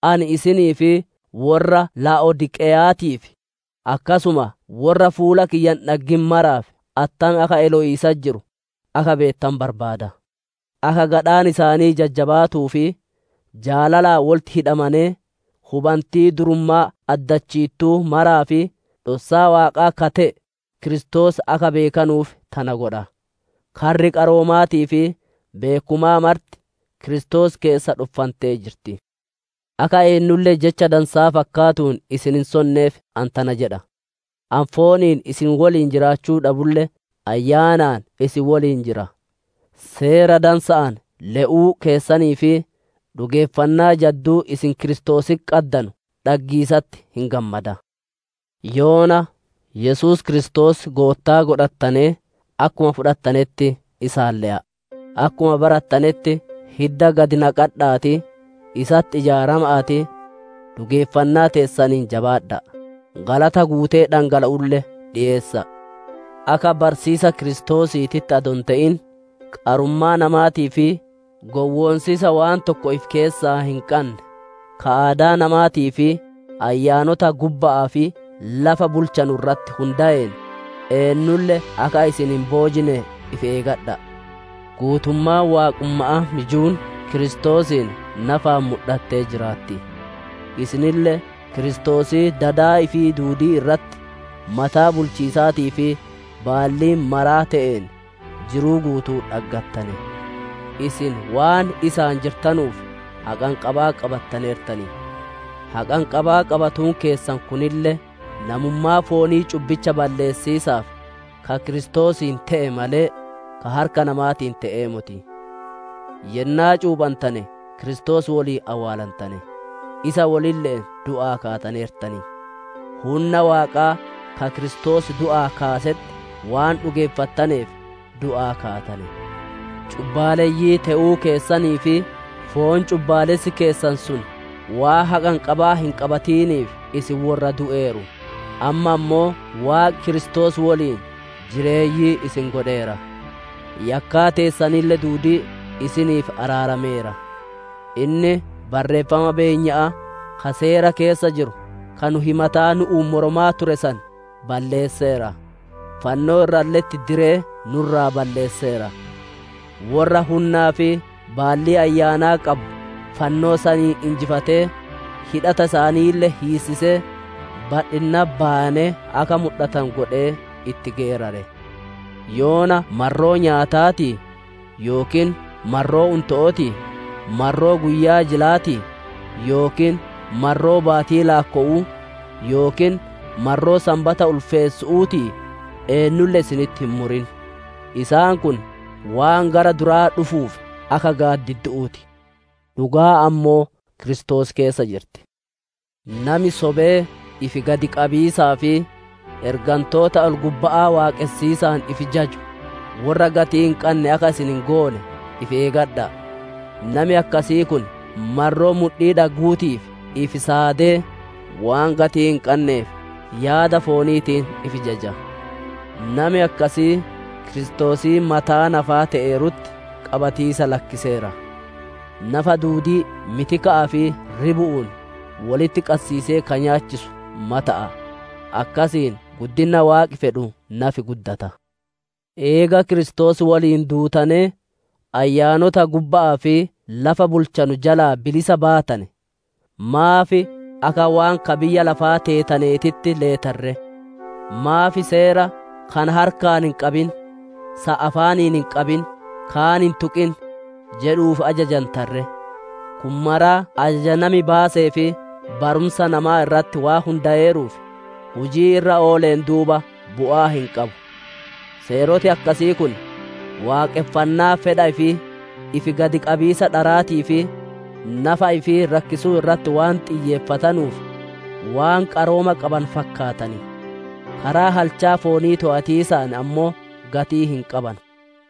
Ani isinii fi worra Laa'odiiqeyaatiif, akkasuma worra fuula kiyya hin dhaggin maraaf attam akka elowiisatti jiru akka beettanu barbaada. Akka gadhaan isaanii jajjabaatuu fi jaalalaan wolitti hidhamanee, hubantii durummaa addachiittuu maraa fi dhossaa Waaqaa ka te'e Kiristoos akka beekanuuf tana godha. Karri qaroomaatii fi beekkumaa marti Kiristoos keessa dhoffantee jirti. Akka eennulle jecha dansaa fakkaatuun isin hin sonneef ani tana jedha. Ani fooniin isin woliin jiraachuu dhabulle ayyaanaan isin woliin jira; seera dansa'aan le'uu keessanii fi dhugeeffannaa jadduu isin Kiristoositti qaddanu dhaggiisatti hin gammada. Yoona Yesuus Kiristoos Goottaa godhattanee, akkuma fudhattanetti isaan le'a'a. Akkuma barattanetti hidda gadi naqadha'aatii, isatti ijaarama'aatii, dhugeeffannaa teessaniin jabaadha'a; galata guutee dhangala'ulle dhiyeessa'a. Akka barsiisa Kiristoosiititti adoo hin te'in, qarummaa namaatii fi gowwoonsiisa waan tokko ifi keessaa hin qanne, ka aadaa namaatii fi ayyaanota gubba'aa fi lafa bulchanu irratti hundayeen, eennulle akka isin hin boojine ifi eegadha'a. Guutummaan waaqumma'aa mijuun Kiristoosiin nafaan mudhattee jiraatti. Isinille Kiristoosii dada ifii duudii irratti mataa bulchiisaatii fi baallii maraa te'een, jiruu guutuu dhaggattane. Isin waan isaan jirtanuuf haqanqabaa qabattaneertan; haqanqabaa qabatuun keessan kunille namummaa foonii cubbicha balleessiisaaf ka Kiristoosiin te'e malee, ka harka namaatiin te'ee moti. Yennaa cuuphantane Kiristoos woliin awwaalantane; isa wolille'een du'aa kaataneertan; hunna Waaqaa ka Kiristoos du'aa kaasetti waan dhugeeffattaneef, du'aa kaatane. Cubbaaleyyii te'uu keessanii fi foon cubbaalessi keessan sun waan haqanqabaa hin qabatiniif isin worra du'eeru; amma ammoo Waaqi Kiristoos woliin jireeyyii isin godheera; yakkaa teessanille duudii isiniif araarameera. Inni barreeffama beenya'aa ka seera keessa jiru, ka nu himataa nu'uun mormaa ture san balleesseera; fannoo irralle'etti diree nu irraa balleesseera. Worra hunnaa fi baallii ayyaanaa qabu fannoo saniin injifatee, hidhata isaaniille hiissisee, badhinnatti bayanee akka mudhatanu godhee itti geerare. Yoona marroo nyaataatii yookiin marroo unto'ootii, marroo guyyaa jilaatii yookiin marroo baatii laakkowu'uu, yookiin marroo Sanbata ulfeessu'uutiif eennulle isinitti hin murin. Isaan kun waan gara duraa dhufuuf akka gaaddiddu'uu ti; dhugaan ammoo Kiristoos keessa jirti. Nami sobee ifi gadi qabiisaa fi ergantoota ol-gubba'aa waaqonsiisaan ifi jaju, worra gatii hin qanne akka isin hin goone ifi eegadha'a; nami akkasii kun marroo mudhii dhagguutiif ifi saadee, waan gatii hin qanneef yaada fooniitiin ifi jaja. Nami akkasii, Kiristoosii mataa nafaa te'eerutti qabatiisa lakkiseera; nafa duudii mitika'aa fi ribu'uun wolitti qassiisee ka nyaachisu mata'a; akkasiin guddinna Waaqi fedhu nafi guddata. Eega Kiristoos woliin duutanee, ayyaanota gubba'aa fi lafa bulchanu jalaa bilisa baatane, maaf akka waan ka biyyaa lafaa teetaneetitti leetan ree? Maaf seera, «Kana harkaan hin qabin, san afaaniin hin qabin, kaan hin tuqin!» jedhuuf ajajantan ree? Kun maraa ajaja nami baasee fi barumsa namaa irratti waan hundayeeruuf, hujii irra ooleen duuba bu'aa hin qabu. Seeroti akkasii kun, waaqonfannaa fedha ifii, ifi gad qabiisa dharaatii fi nafa ifii rakkisuu irratti waan xiyyeeffatanuuf, waan qarooma qabanu fakkaatan; karaa halchaa foonii toowatiisaatiin ammoo gatii hin qabanu.